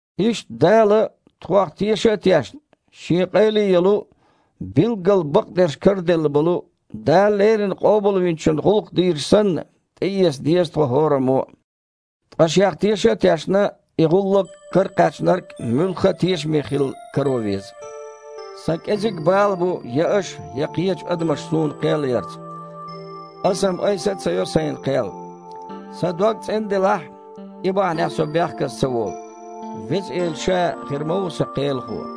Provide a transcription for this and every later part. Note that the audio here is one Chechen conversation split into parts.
Иштта, Дала, тхох теша а тешна, Шен къайле йолу, билггал бакъдерш караделла болу Дала леррина Къобалвинчун гІуллакх дийраш санна тІеэца деза тхо хІораммо а. Ткъа, шех теша а тешна, и гІуллакх каракхаьчнарг муьлхха а тешаме хилла каро веза. Сан кІезиг бала бу я аша, я кхечу адамаша суна кхел ярца. Аса-м айса а ца йо сайна кхел. Сан дог цІена делахь а, и бахьанехь со бехказа ца волу. Веза Эла Ша хир ма ву сан Кхелахо.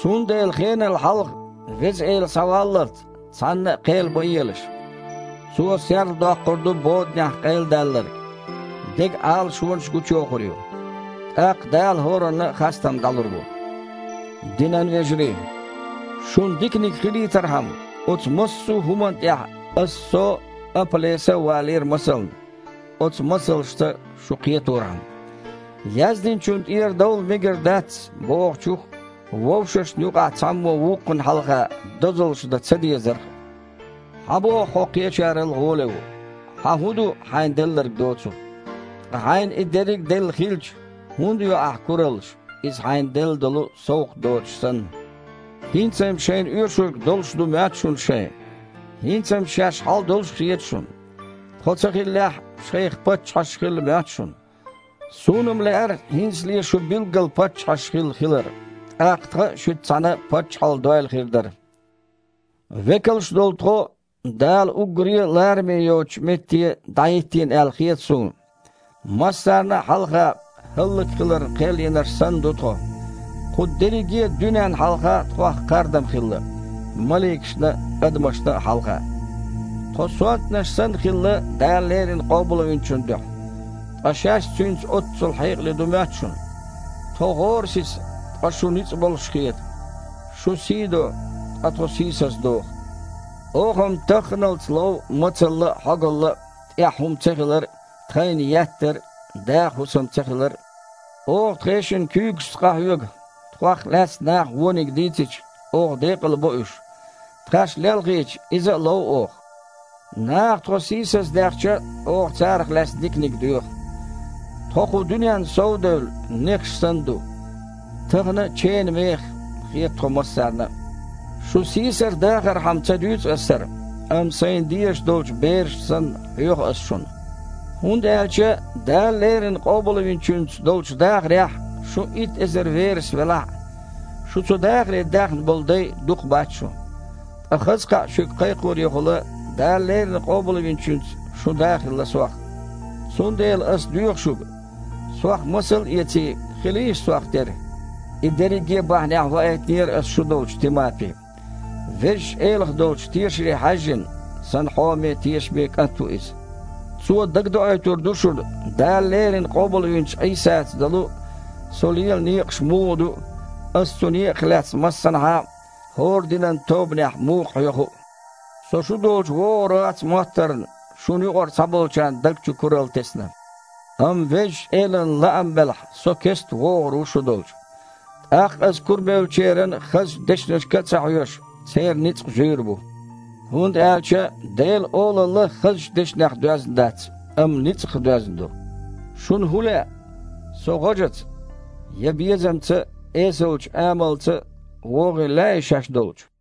Цундела хенал хьалха, Веза Эла схьаваллалц, цхьанна а кхел ма елаш. Цо серладоккхур ду боданехь къайладаьлларг, деган Іалашонаш а гучуйохур ю. ТІаккха Дала хІоранна а хастам дІалур бу. Динан вежарий! Шуна диканиг хилийтархьама, оцу массо а хІуманна тІехь аса со а, Апа-Леса а валийра масална, оцу масалшца шу кхеторхьама «Яздинчунна тІера довла мегар дац» бохучух а, вовшашна юкъахь цхьаммо вукхунна хьалха дозаллаш дан ца дезарх а. Хьан боху хьо кхечарал гІоле ву? Хьан хІун ду, хьайна делларг доцург? Ткъа хьайна и дерриг а делла хилча, хІунда йо ахьа кураллаш, иза хьайна делла долу совгІат доцуш санна? ХІинца-м шайна оьшург долуш ду моьтту шуна шайн. ХІинца-м шаьш хьал долуш а хета шуна. Тхо ца хиллехь а, шайх паччахьаш хилла моьтту шуна. Суна-м лаьара, хІинцале а шу билггал паччахьаш хилла хилар, тІаккха тхан а шуьца цхьаьна паччахьалла дойла хир дара! Векалш долу тхо, Дала уггаре а лараме йоцучу метте дІахІиттийна аьлла хета суна. Массарна а хьалха хІаллакьхиларна кхел йинарш санна ду тхо. Кху дерриге а дуьненна хьалха тхох кхардам хилла – маликашна а, адамашна а хьалха. Тхо сонтанаш санна хилла Дала леррина Къобалвинчун дуьхьа, ткъа шаьш Цуьнца оццул хьекъале ду моьтту шуна! Тхо гІорасиза, ткъа шу ницкъ болуш хета. Шун сий до, ткъа тхо сийсаздоху. Оха-м тахханалц а лов мацалла а, хьогалла а, тІехь хІума цахилар а, тхайна еттар а, даха хІусам цахилар а. Оха тхешан куьйгашца къахьоьгу. Тхох лаьцна наха вониг дийцича, оха декъалбо уьш. Тхаьш лелхийча, иза а лов оха. Наха тхо сийсаздаьхча а, оха царах лаьцна диканиг доьху. Тхо, кху дуьненна сов а девлла, нехаш санна ду. Тахана а ченан мехах хета тхо массарна а. Шу сийсаздахархьама ца дуьйцу ас хІара, амма сайна дезаш долчу берашна санна хьоьху ас шуна. ХІунда аьлча Дала леррина Къобалвинчуьнца долчу дахарехь шун итт эзар верас велахь а, шу цу дахаре даьхна болу дай дукха бац шун. Ткъа хаза кхаъ шуьга кхайкхорехула Дала леррина Къобалвинчуьнца шун да хилла сох. Цундела ас доьху шуьга: сох масал а эций, хилийша сох тера. И дерриге а бахьанехь ваийтинера аса шу долчу Тимапи. Везачу Элах долчу тешаре хьаьжжина, сан хьоме а, тешаме а кІант ву иза. Цо дагадоуьйтур ду шуна Дала леррина къобалвинчу Іийсаца долу со лела некъаш муха ду а, аса цу некъах лаьцна массанхьа а, хІорра динан тобанехь а муха хьоьху а. Со шу долчу вогІур вац моттарна, шуна юкъара цхьаболчарна даг чу куралла тесна. Амма Везачу Элан лаам белахь, со кестта вогІур ву шу долчу. ТІаккха аса, курабевллачеран хазачу дешнашка а ца хьоьжуш, церан ницкъ зуьйр бу. ХІунда аьлча Делан Олалла хазачу дешнех доьзна дац, амма ницкъах доьзна ду. Шуна хІун лаьа? Со гІожаца я безамца а, эсалчу амалца а вогІийла лаьий шаьш долчу?